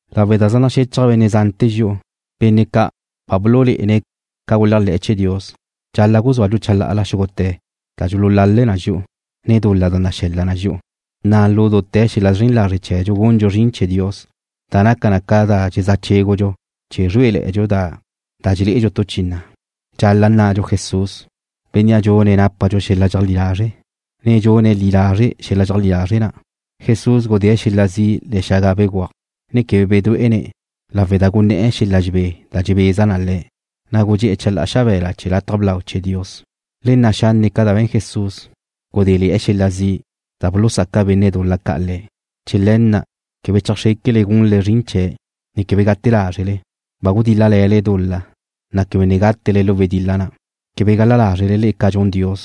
Lawe' da zaj naxéchaj benne' zante̱ dxi'u, benne' ca' ba bululé'ene̱' ca guléajle̱'e̱ chee̱ Dios, dxal-la' guzúadxu chalá'ala xúgute̱ da dxululale na dxi'u, ne dul-la da naxe̱l-la na dxi'u, na' lu dute̱ xel-la' zren lazre' chee̱dxu gundxu zrin chee̱ Dios, da naca na ca dxezá' chégudxu chee̱ zrué'eledxu da dxelé'edxu tu chi na'. Dxal-la' nna'dxu Jesús, Bénnea' dxune̱' nápadxu xel-la' dxeajlí lazre', ne dxune̱' li lazre' xel-la' dxeajlí lazre' na'. Jesús gudée̱' xel-la' zi' le̱'e̱ xaga begúaj, ne quebe bedué'ene̱' lawe' da guné̱'e̱ xel-la' dxebé na' da dxebeza na Le̱', na' gudxé'e̱ chalá'a xabe̱la chee̱ lataj blau chee̱ Dios. Le nna' xanne' ca da be̱n Jesús, gudéle̱'e̱ xel-la' zi' da bulusaca benne' dul-la ca' Le̱'. Chee̱ le̱ na' quebe chajxréquele gunle zrin chee̱', ne quebe gute lázrele. Ba gudíl-lale̱le dul-la, na' quebe ne gátele lu wedil-la na'. Quebe gal-la lázrele le'e ca dxun Dios,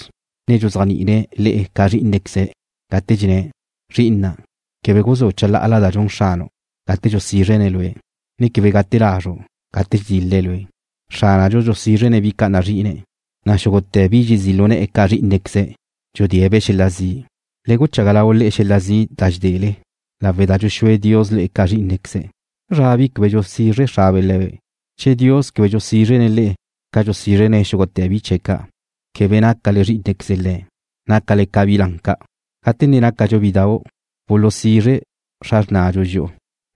dxuzéajni'ine̱' le'e ca zrí'inequeze̱', gate dxenné̱': Zri'ina', quebe guzú' chalá'ala da dxun Xranu' gate dxusízrene̱' lue', ne quebe gate lazru' gate dxedil-le̱' lue'. Xránadxu dxusízrene̱' bi ca' nazri'ine̱', na' xúgute̱ bi dxezí' lu ne̱'e̱ ca zrí'inequeze̱' dxudée̱'-be' xel-la' zi'. Le guchaga lau le'e xel-la' zi' da dxedele, lawe' da dxuxúe Dios le'e ca zrí'inequeze̱'. ¿Zra bi quebe dxusizre xrabe' le̱be'? Che Dios quebe dxusízrene̱' le'e ca dxusízrene̱' xúgute̱ bi chee̱' ca', quebe nácale zrí'inequeze Le̱'. Nácale ca bi lan ca'. Gate ne nácadxu bidau', bulusizre xra xrnadxu dxi'u,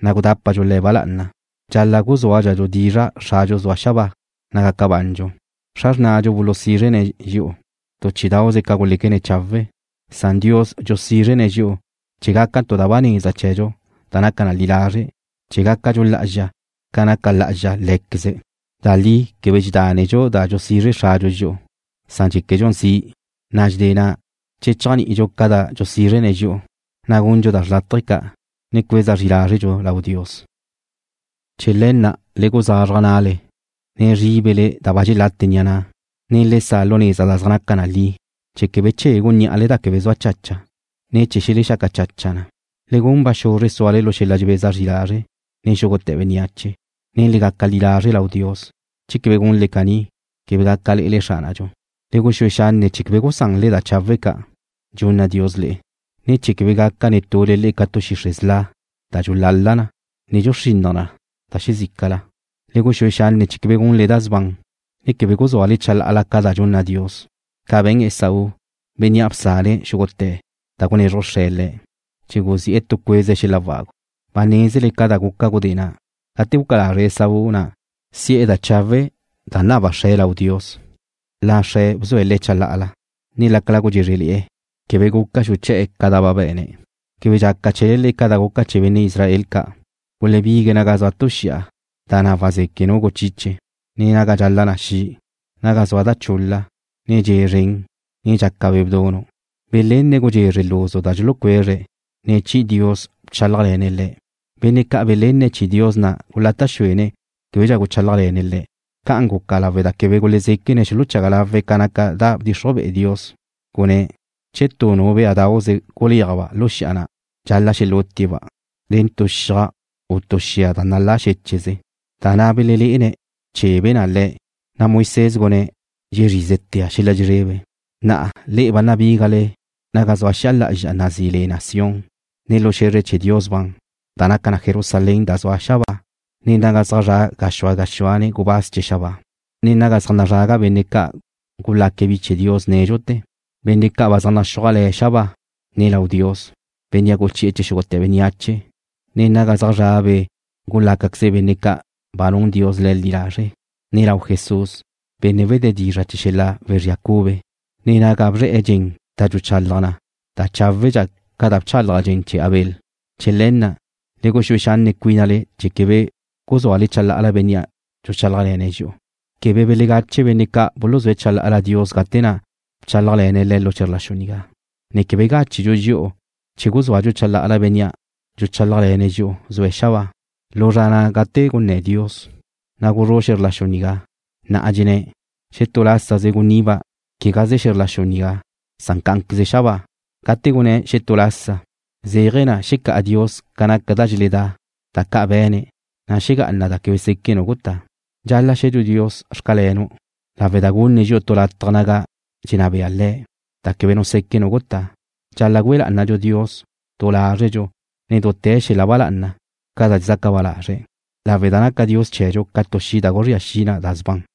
na' gudápadxu le̱' ba lá'ana. Dxal-la' guzúadxadxu dizra' Xradxu zue̱' xabáa, na' gaca bandxu. Xra xrnadxu bulusízrene̱' dxi'u tu chí'idauze ca da guléquene̱' chawe', san Dios dxusízrene̱' dxi'u chee̱ gaca tu da ba neza chee̱dxu da naca na li lazre', chee̱ gácadxu lá'azxa ca naca lá'azxa Lé̱queze̱'. Da li quebe dxedánnedxu da dxusizre xradxu dxi'u, san dxéquedxu zi', na' dxedé na', che dxéajni'idxu ca da dxusízrene̱' dxi'u, na' gundxu da xrlátaje ca', ne cueza zri lázredxu lau Dios. Chee̱ le̱ na' le guzazraj na'le, ne zríbele da ba dxelate ni'a na', ne le sa' lu neza da zaj naca na li, chee̱ quebe chegu ní'ale da quebe zaj zua chacha, ne chee̱ xelexaca chacha na. Le gun ba xuzre suale lu xel-la' dxebeza zri lazre' nen xúgute̱ bénneache, ne le gaca li lazre' lau Dios. Che quebe gunle caní, quebe gaca lé'elele Xránadxu. Le guxúe xanne' chee̱ quebe gusanle da chawe' ca' dxunna Dios le'e, ne̱ chee̱ quebe gaca netule le'e ca tu xixre' sla' da dxulala na, ne dxuxrinnaj na da xezícala. Le guxúe xanne' chee̱ quebe gunle da sban, ne quebe guzúale chalá'ala ca da dxunna Dios, ca be̱n Esaú, bénnea' bsane̱' xúgute̱ da gunezruj xre̱' le̱' chee̱ guzi'e̱ tu cueze xel-la' wagu. Ba nézele ca da guca gudé na', gate guca lazre' Esaú na' si'e̱ da chawe' da naba xre̱' lau Dios, na' xre̱' bzue̱' le̱' chalá'ala, ne lácala gudxézrele̱'e̱, quebe guca xuché̱'e̱ ca da ba be̱ne̱'. Quebe dxaca chee̱le ca da guca chee̱ benne' Israel ca', gulebigue̱' naga zua tu xi'a, da na' wazeque' nu guchiche, ne naga dxala na xi', naga zua da chul-la, ne dxe' zren, ne dxaca be' bdunu'. Belenne̱' gudxezre luzu da dxulucuezre̱', ne chi'i Dios bchálajle̱ne̱' le̱'. Benne' ca' belenne̱' chi'i Dios na' gulata' xúene̱' québedxa guchálajle̱ne̱' le̱'. Ca'an guca lawe' da quebe gulezéquene̱' xuluchaga lawe̱' ca naca da bdxixruj be'e Dios, gunné̱': “Che tu béadauze guléajba' lu xi'a na', dxal-la' xelútie̱'-ba' nen xiaj u nen tu xia nalá xéche'ze.” Da na' belelé'ene̱' bchébele̱'e̱ na le̱', na' Moisés gunné̱': “Dxezrízetea' xel-la' dxezrebe.” Na'a le'e ba nabígale naga zua xi'a lá'azxa da nazí le na Sión, ne lu xe̱zre chee̱ Dios ban, da naca na Jerusalén da zua xabáa, ne naga zaj zra' gázxue gázxue gubáz chee̱ xabáa, ne naga zaj nazraga benne' ca' gulaca bi chee̱ Dios nédxute̱, benne' ca' ba zaj naxúaj le̱' xabáa, ne lau Dios, Bénnea' guchi'e̱ chee̱ xúgute̱ bénneache, ne naga zaj zra' be' gulácaqueze benne' ca' ba nun Dios le̱' li lazre', ne lau Jesús, Benne' wedé dizra' chee̱ xel-la' wezría cube, ne naga bzre̱'e̱ dxen da dxuchalaj na da cháwedxa ca da bchalaj dxen chee̱ Abel. Chee̱ le̱ na', le guxúe xanne' cuínale chee̱ quebe guzúale chalá'ala Bénnea' dxuchálajle̱ne̱' dxi'u. Quebe belegache benne' ca' buluzúe̱' chalá'ala Dios gate na' bchálajle̱ne̱' le̱' lu xe̱zr la xu nigá, ne quebe gáchedxu dxi'u che guzúadxu chalá'ala Bénnea' dxuchálajle̱ne̱' dxi'u, zue̱' xabáa. Lu zra na' gate gunná Dios, na' guzrú' xe̱zr la xu nigá. Na'a dxenné̱': “Xetú lásaze guniba' quegaze xe̱zr la xu nigá, san cá'anqueze xabáa.” Gate gunné̱': “Xetú lásaze”, zéaje̱ na xecá'a Dios ca naca da dxeledá, da ca' be̱ne̱', na' xegá'ana da quebe seque' nu gutá. Dxal-la' xe̱dxu Dios: Xcalenu' lawe' da gunne̱' dxi'u tu lataj naga dxenná bea Le̱' da quebe seque' nu gutá. Dxal-la' güe lá'anadxu Dios du lázredxu ne dute̱ xel-la' ba lá'ana, ca da dxezaca ba lazre̱', lawe' da naca Dios chee̱dxu ca tu xi' da guzría xi na da sban.